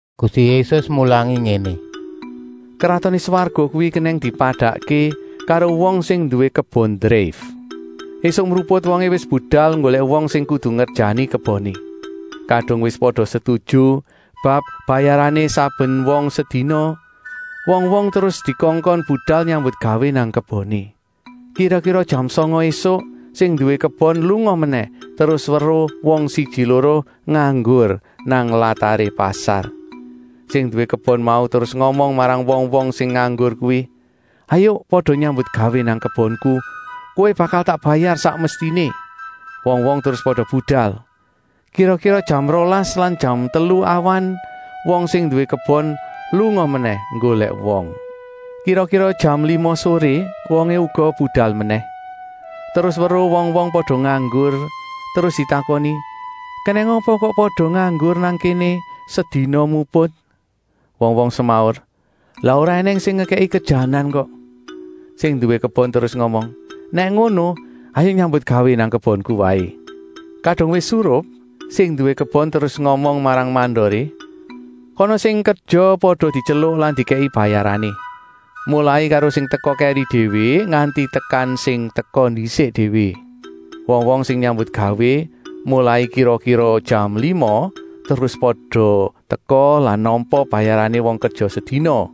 Gusti Yésus mulangi ngéné: “Kratoné Swarga kuwi kenèng dipadakké karo wong sing nduwé kebon dreif. Esuk mruput wongé wis budal nggolèk wong sing kudu ngerjani keboné. Kadung wis pada setuju bab bayarané saben wong sedina, wong-wong terus dikongkon budal nyambutgawé nang keboné. Kira-kira jam sanga ésuk sing nduwé kebon lunga menèh terus weruh wong siji-loro nganggur nang lataré pasar. Sing nduwé kebon mau terus ngomong marang wong-wong sing nganggur kuwi: ‘Hayuk pada nyambutgawé nang kebonku, kowé bakal tak bayar sak mestiné!’ Wong-wong terus pada budal. Kira-kira jam rolas lan jam telu awan wong sing nduwé kebon lunga menèh nggolèk wong. Kira-kira jam lima soré wongé uga budal menèh, terus weruh wong-wong pada nganggur, terus ditakoni: ‘Kenèng apa kowé kok pada nganggur nang kéné sedina muput?’ Wong-wong semaur: ‘Lah ora ènèng sing ngekèki kerjanan kok!’ Sing nduwé kebon terus ngomong: ‘Nèk ngono, hayuk nyambutgawé nang kebonku waé.’ “Kadung wis surup, sing nduwé kebon terus ngomong marang mandoré: ‘Kana sing kerja pada dityeluk lan dikèki bayarané. Molai karo sing teka kèri déwé nganti tekan sing teka ndisik déwé.’ Wong-wong sing nyambutgawé molai kira-kira jam lima terus pada teka lan nampa bayarané wong kerja sedina.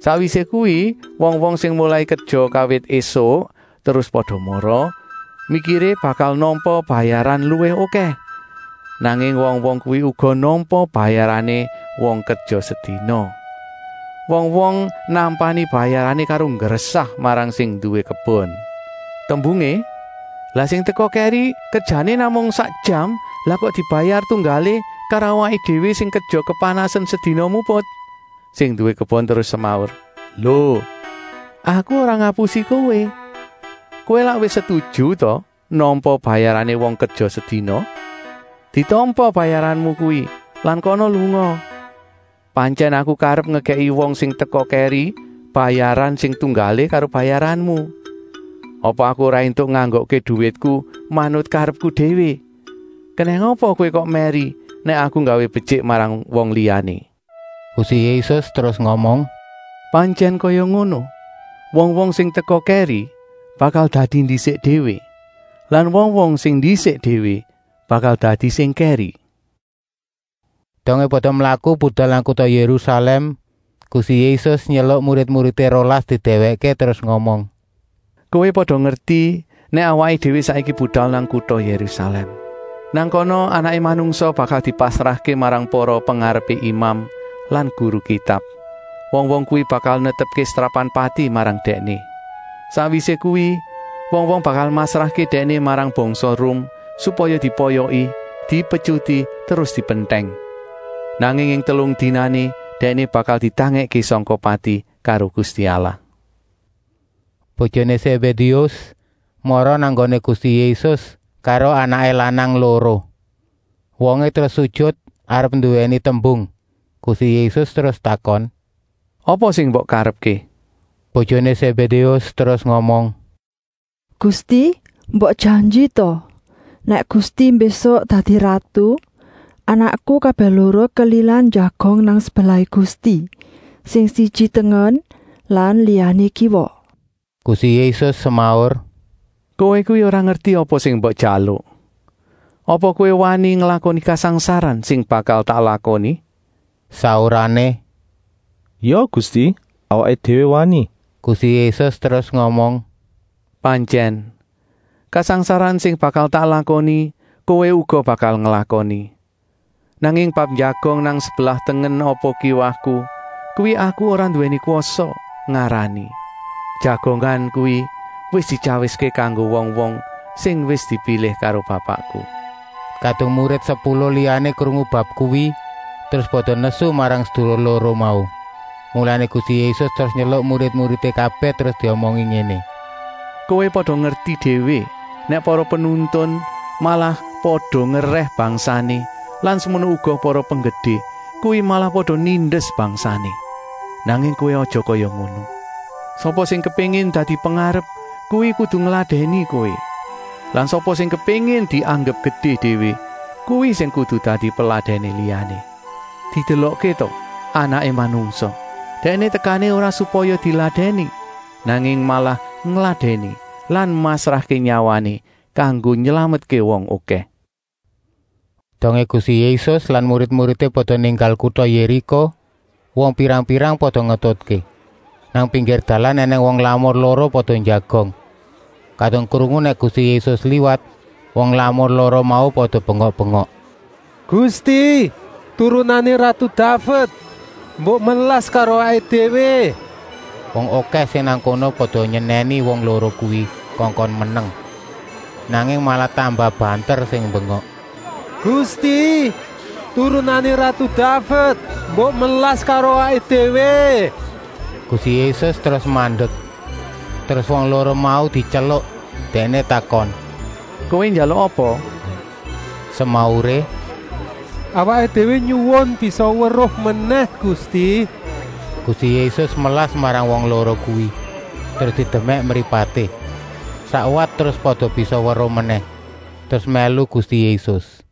Sakwisé kuwi wong-wong sing molai kerja kawit ésuk terus pada mara, mikiré bakal nampa bayaran luwih okèh. Nanging wong-wong kuwi uga nampa bayarané wong kerja sedina. Wong-wong nampani bayarané karo nggresah marang sing nduwé kebon. Tembungé: ‘Lah sing teka kèri kerjané namung sak jam, lah kok dibayar tunggalé karo awaké déwé sing kerja kepanasen sedina muput.’ “Sing nduwé kebon terus semaur: ‘Lo, aku ora ngapusi kowé! Kowé lak wis setuju ta nampa bayarané wong kerja sedina? Ditampa bayaranmu kuwi lan kana lunga! Pantyèn aku karep ngekèki wong sing teka kèri bayaran sing tunggalé karo bayaranmu. Apa aku ora éntuk nganggokké duwitku manut karepku déwé? Kenèng apa kowé kok mèri nèk aku nggawé betyik marang liyané?’” Gusti Yésus terus ngomong: “Pantyèn kaya ngono, wong-wong sing teka kèri bakal dadi ndisik déwé lan wong-wong sing ndisik déwé bakal dadi sing kèri.” Dongé pada mlaku budal nang kuta Yérusalèm, Gusti Yésus nyeluk murid-muridé rolas didèwèkké, terus ngomong: “Kowé pada ngerti nèk awaké déwé saiki budal nang kuta Yérusalèm. Nang kana Anaké Manungsa bakal dipasrahké marang para pengarepé imam lan guru Kitab. Wong-wong kuwi bakal netepké setrapan pati marang Dèkné. Sakwisé kuwi wong-wong bakal masrahké Dèkné marang bangsa Rum, supaya dipoyoki, dipetyuti terus dipentèng. Nanging ing telung dinané Dèkné bakal ditangèkké sangka pati karo Gusti Allah.” Bojoné Sébédéus mara nang nggoné Gusti Yésus karo anaké lanang loro. Wongé terus sujut arep nduwèni tembung. Gusti Yésus terus takon: “Apa sing mbok karepké?” Bojoné Sébédéus terus ngomong: “Gusti, mbok janji ta, nèk Gusti mbésuk dadi ratu, anakku kabèh loro kelilan njagong nang sebelahé Gusti, sing siji tengen lan liyané kiwa?” Gusti Yésus semaur: “Kowé kuwi ora ngerti apa sing mbok jaluk. Apa kowé wani nglakoni kasangsaran sing bakal tak lakoni?” Saurané: “Ya Gusti, awaké déwé wani!” Gusti Yésus terus ngomong: “Pantyèn, kasangsaran sing bakal tak lakoni kowé uga bakal nglakoni. Nanging bab njagong nang sebelah tengen apa kiwaku, kuwi Aku ora nduwé kwasa ngarani. Jagongan kuwi wis dityawiské kanggo wong-wong sing wis dipilih karo Bapakku.” Kadung murid sepuluh liyané krungu bab kuwi, terus pada nesu marang sedulur loro mau. Mulané Gusti Yésus terus nyeluk murid-muridé kabèh terus diomongi ngéné: “Kowé pada ngerti déwé nèk para penuntun malah pada ngerèh bangsané lan semono uga para penggedé, kuwi malah pada nindes bangsané. Nanging kowé aja kaya ngono. Sapa sing kepéngin dadi pengarep, kuwi kudu ngladèni kowé. Lan sapa sing kepéngin dianggep gedé déwé, kuwi sing kudu dadi peladèné liyané. Didelokké ta Anaké Manungsa, Dèkné tekané ora supaya diladèni, nanging malah ngladèni lan masrahké nyawané kanggo nylametké wong okèh.” Dongé Gusti Yésus lan murid-muridé pada ninggal kuta Yériko, wong pirang-pirang pada ngetutké. Nang pinggir dalan ènèng wong lamur loro pada njagong. Kadung krungu nèk Gusti Yésus liwat, wong lamur loro mau pada bengok-bengok: “Gusti, Turunané ratu Daved, mbok melas karo awaké déwé!” Wong okèh sing nang kono pada nyenèni wong loro kuwi kongkon meneng. Nanging malah tambah banter sing mbengok: “Gusti, Turunané ratu Daved, mbok melas karo awaké déwé!” Gusti Yésus terus mandek, terus wong loro mau dityeluk. Dèkné takon: “Kowé njaluk apa?” Semauré: “Awaké déwé nyuwun bisa weruh menèh, Gusti!” Gusti Yésus melas marang wong loro kuwi, terus didemèk mripaté. Sakwat terus pada bisa weruh menèh, terus mèlu Gusti Yésus.